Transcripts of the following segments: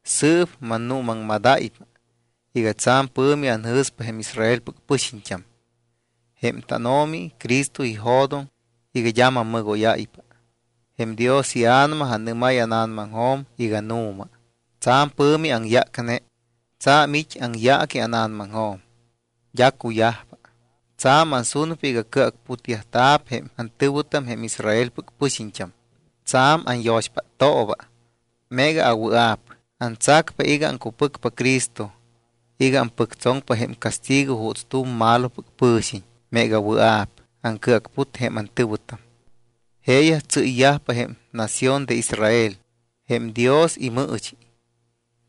Sɨɨp mannuumaŋmadáypa iga tsa̱m pɨ̱mi anjɨ̱spa jém Israelpɨc pɨxiñt́am. Jém tánO̱mi Cristo ijo̱doŋ iga d́a mammɨgóyáypa. Jém Dios iA̱nama anɨ́máy ána̱namaŋjo̱m iga nu̱ma. Tsa̱m pɨ̱mi aŋyácne. Tsa̱m it́ aŋyaaqui ána̱namaŋjo̱m, d́a cuyajpa. Tsa̱m ansunpa iga cɨacputyajta̱p jém antɨ̱wɨtam jém Israelpɨc pɨxiñt́am. Tsa̱m anyo̱xpáttooba. Meega awɨa̱p, antsacpa iga aŋcupɨcpa Cristo iga ampɨctsoŋpa jém castigo juuts tu̱m malopɨc pɨ̱xiñ meega wɨa̱p aŋcɨacput jém antɨ̱wɨtam. Jeeyaj tsɨ́yyajpa jém nación de Israel, jém Dios imɨɨchi.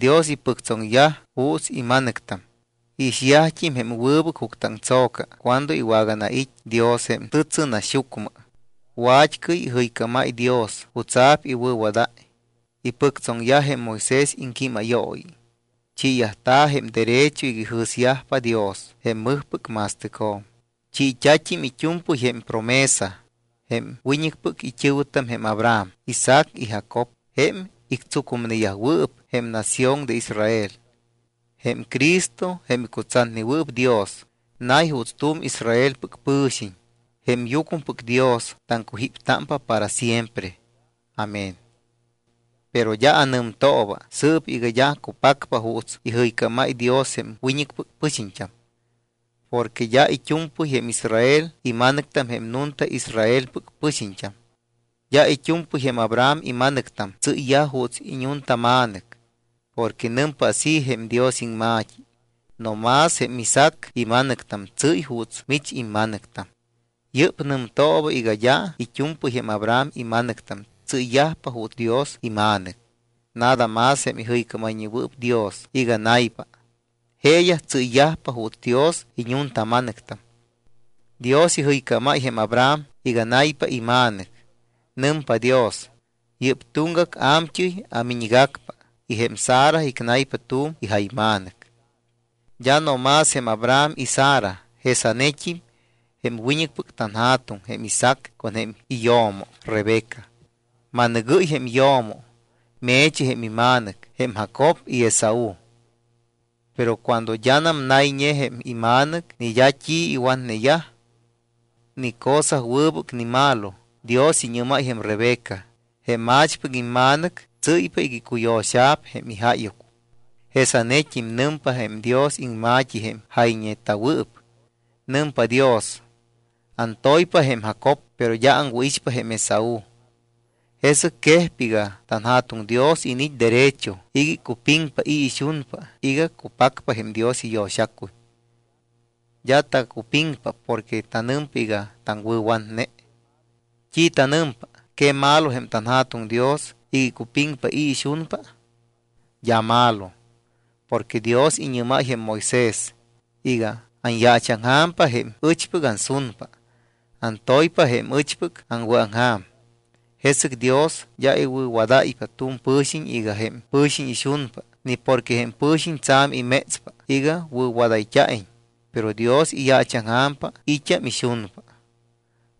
Dios ipɨctsoŋyaj juuts ima̱nɨctam. Iixyajt́im jém wɨbɨc juctɨaŋtso̱ca cuando iwaganait́ Dios jém tɨtsɨnaxyucmɨ. Wa̱t́cɨy ijɨycámáy Dios jutsa̱p iwɨ̱wadáy. Ipɨctsoŋyaj jém Moisés iŋquímayooyi. Chiiyajta̱ jém derecho iga ijɨ̱syajpa Dios jém mɨjpɨc ma̱stɨcjo̱m. Chiit́a̱t́im it́u̱mpɨy jém promesa. Jém wiñɨcpɨc it́ɨ̱wɨtam jém Abraham, Isaac y Jacob; jém ictsucumneyajwɨɨp jém nación de Israel. Jém Cristo, jém icutsatnewɨɨp Dios, nay juuts tu̱m Israelpɨc pɨ̱xiñ. Jém yucmɨpɨc Dios taŋcujíptámpa para siempre. Amén. Pero d́a anɨmtooba sɨɨp iga d́a cupacpa juuts ijɨycámáy Dios jém wiñɨcpɨc pɨxiñt́am. Porque d́a it́u̱mpɨy jém Israel ima̱nɨctam jém nunta Israelpɨc pɨxiñt́am. D́a it́u̱mpɨy jém Abraham ima̱nɨctam tsɨ́yyaj juuts iñuntama̱nɨc. Porque nɨmpa así jém Dios iŋma̱t́i: “No más jém Isaac ima̱nɨctam tsɨ́y juuts mich imma̱nɨctam.” Yɨ́p nɨmtooba iga d́a it́u̱mpɨy jém Abraham ima̱nɨctam tsɨ́ypa juuts Dios ima̱nɨc. Nada más jém ijɨycámayñewɨɨp Dios iga naypa, jeeyaj tsɨ́ypa juuts Dios iñuntama̱nɨctam. Dios ijɨycámáy jém Abraham iga naypa ima̱nɨc. Nɨmpa Dios: “Yɨ́p tuŋgac a̱mt́ɨy amiñgacpa y jém Sara icnaypa tu̱m ijayma̱nɨc.” D́a no más jém Abraham y Sara. Jesanet́im jém wiñɨcpɨc tanja̱tuŋ jém Isaac con jém iyo̱mo Rebeca. Ma̱nɨgɨ́y jém yo̱mo. Me̱chi jém ima̱nɨc jém Jacob y Esaú. Pero cuando d́anam nayñe jém ima̱nɨc, ni d́a t́i iwatneyaj, ni cosa wɨbɨc ni malo, Dios iñɨ́máy jém Rebeca: “Jém a̱chpɨc imma̱nɨc tsɨ́ypa iga icuyo̱xa̱p jém ijáyuc.” Jesanet́im nɨmpa jém Dios iŋma̱t́i jém jayñeta̱wɨɨp. Nɨmpa Dios: “Antoypa jém Jacob, pero d́a aŋwɨ̱ixpa jém Esaú.” Jesɨc quejpa iga tanJa̱tuŋ Dios iniit́ derecho iga icupiŋpa i̱ ixunpa iga cupacpa jém Dios iyo̱xacuy. D́a tacupiŋpa porque tanɨmpa iga taŋwɨ̱watne. ¿T́i tanɨmpa? ¿Que malo jém tanJa̱tuŋ Dios iga icupiŋpa i̱ ixunpa? D́a malo. Porque Dios iñɨ́máy jém Moisés iga: “Anyaachaŋja̱mpa jém ɨchpɨc ansunpa, antoypa jém ɨchpɨc aŋwɨ̱aŋja̱m.” Jesɨc Dios d́a iwɨ̱wadáypa tu̱m pɨ̱xiñ iga jém pɨ̱xiñ ixunpa ni porque jém pɨ̱xiñ tsa̱m imétspa iga wɨ̱wadayt́a̱iñ, pero Dios iyaachaŋja̱mpa i̱t́am ixunpa.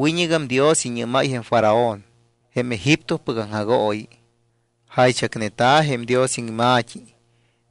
Wiñɨgam Dios iñɨ́máy jém Faraón jém Egiptopɨc aŋjagooyi. Jaychacneta̱ jém Dios iŋma̱t́i: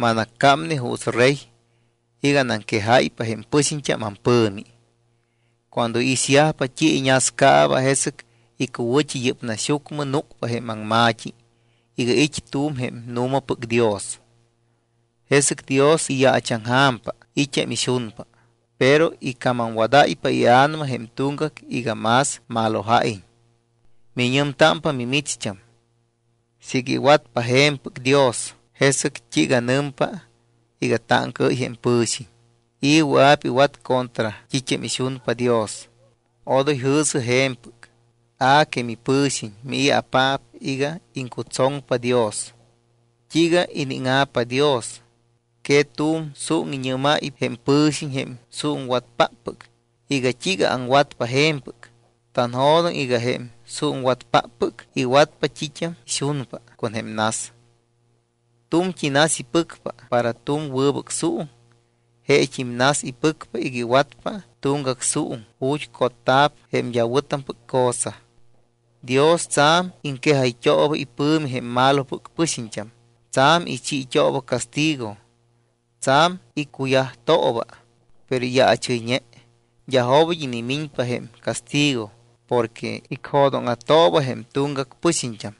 “Manaccámne juuts rey iga anaŋquejáypa jém pɨxiñt́am ampɨ̱mi. Cuando iixyajpa t́i iññascaaba, jesɨc icuwɨ̱t́i yɨ́p naxyucmɨ núcpa jém aŋma̱t́i iga it́ tu̱m jém nu̱mapɨc Dios.” Jesɨc Dios iyaachaŋja̱mpa i̱t́am ixunpa, pero icamamwadáypa ia̱nama jém tuŋgac iga más maloja̱iñ. Miñɨmtámpa mimicht́am: “Siiga iwatpa je̱mpɨc Dios, ¿jesɨc t́iiga nɨmpa iga táŋcaɨ́y jém pɨ̱xiñ? ¿I̱ wɨa̱p iwat contra t́it́am ixunpa Dios?” Odoy jɨ̱sɨ je̱mpɨc. A que mipɨ̱xiñ, ¿mii̱apaap iga iŋcutsoŋpa Dios? ¿T́iiga iníŋa̱pa Dios? ¿Que tu̱m suuŋ iñɨ́máy jém pɨ̱xiñ, jém suuŋwatpáppɨc, iga: “¿T́iiga aŋwat je̱mpɨc?” Tanjo̱doŋ iga jém suuŋwatpáppɨc iwatpa t́it́am ixunpa con jém nas. Tu̱mt́i nas ipɨcpa para tu̱m wɨbɨc suuŋ, jeet́im nas ipɨcpa iga iwatpa tuŋgac suuŋ ju̱t́ cotta̱p jém d́a wɨ̱tampɨc cosa. Dios tsa̱m iŋquejayt́ooba ipɨ̱mi jém malopɨc pɨxiñt́am, tsa̱m ichiit́ooba castigo, tsa̱m iccuyajtooba, pero iyaachɨyñe. D́a jobit́ inimiñpa jém castigo porque icjo̱dóŋa̱tooba jém tuŋgac pɨxiñt́am,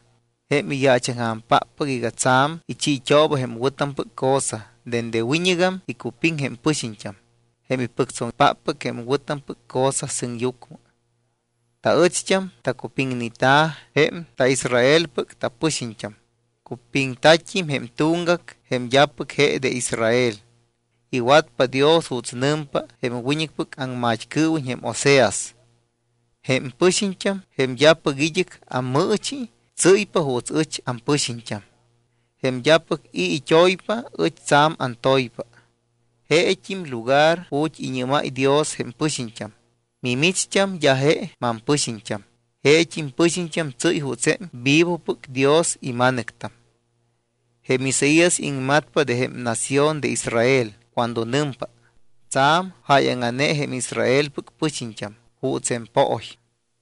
jém iyaachaŋja̱mpáppɨc, iga tsa̱m ichiit́ooba jém wɨ̱tampɨc cosa. Dende wiñɨgam icupiŋ jém pɨxiñt́am, jém ipɨctsoŋpáppɨc jém wɨ̱tampɨc cosa sɨŋyucmɨ. Taɨcht́am tacupiŋneta̱ jém taIsraelpɨc tapɨxiñt́am. Cupiŋta̱t́im jém tuŋgac, jém d́apɨc je de Israel. Iwatpa Dios juuts nɨmpa jém wiñɨcpɨc aŋmat́cɨɨwiñ jém Oseas: Jém pɨxiñt́am, jém d́apɨc id́ɨc ammɨɨchi, tsɨ́ypa juuts ɨch ampɨxiñt́am. Jém d́apɨc i̱ it́oypa, ɨch tsa̱m antoypa. Jeet́im lugar ju̱t́ iñɨ́máy Dios jém pɨxiñt́am: “Mimicht́am d́a je mampɨxiñt́am”, jeet́im pɨxiñt́am tsɨ́y juuts jém vivopɨc Dios ima̱nɨctam. Jém Isaías iŋmatpa de jém nación de Israel cuando nɨmpa: Tsa̱m jáyaŋa̱ne jém Israelpɨc pɨxiñt́am juuts jém pooy,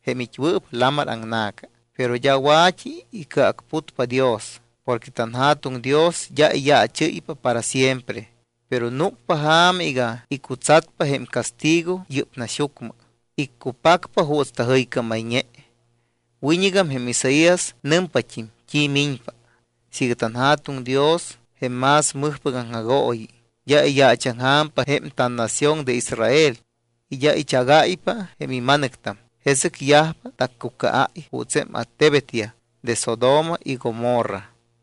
jém it́wɨɨp lamar aŋna̱ca, pero d́a wa̱t́i icɨacputpa Dios. Porque tanJa̱tuŋ Dios d́a iyaachɨ́ypa para siempre, pero núcpa ja̱ma iga icutsatpa jém castigo yɨ́p naxyucmɨ. Iccupacpa juuts tajɨycámayñe. Wiñɨgam jém Isaías nɨmpat́im t́i miñpa: Siiga tanJa̱tuŋ Dios, jém más mɨjpɨc aŋjagooyi, d́a iyaachaŋja̱mpa jém tannación de Israel y d́a ichagáypa jém ima̱nɨctam, jesɨc yajpa taccucaáy juuts jém attebetyaj de Sodoma y Gomorra.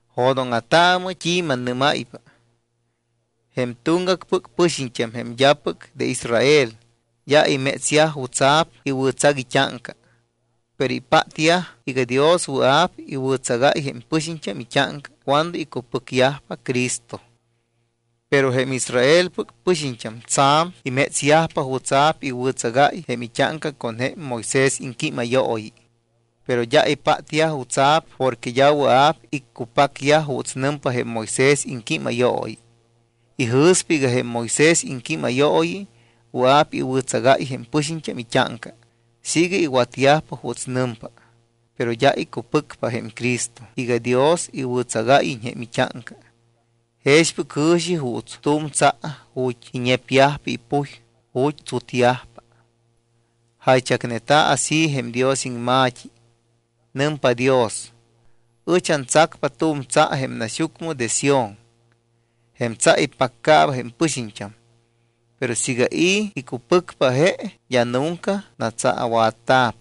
Jo̱dóŋa̱taamɨ t́i mannɨ́máypa. Jém tuŋgacpɨc pɨxiñt́am, jém d́apɨc de Israel, d́a imétsyaj jutsa̱p iwɨ̱tsac it́áŋca. Pero ipátyaj iga Dios wɨa̱p iwɨ̱tsagáy jém pɨxiñt́am it́áŋca cuando icupɨcyajpa Cristo. Pero jém Israelpɨc pɨxiñt́am tsa̱m imétsyajpa jutsa̱p iwɨ̱tsagáy jém it́áŋca con jém Moisés iŋquímayooyi, pero d́a ipátyaj jutsa̱p porque d́a wɨa̱p iccupacyaj juuts nɨmpa jém Moisés iŋquímayooyi. Ijɨ̱spa iga jém Moisés iŋquímayooyi wɨa̱p iwɨ̱tsagáy jém pɨxiñt́am it́áŋca siiga iwatyajpa juuts nɨmpa, pero d́a icupɨcpa jém Cristo iga Dios iwɨ̱tsagáyiñ jém it́áŋca. Jexpɨc jɨ̱xi juuts tu̱m tsa ju̱t́ iñepyajpa ipuy, ju̱t́ tsutyajpa. Jaychacneta̱ así jém Dios iŋma̱t́i. Nɨmpa Dios: Ɨch antsacpa tu̱m tsa jém naxyucmɨ de Sión. Jém tsa ipaccaaba jém pɨxiñt́am. Pero siiga i̱ icupɨcpa je, d́a nunca natsaawatta̱p.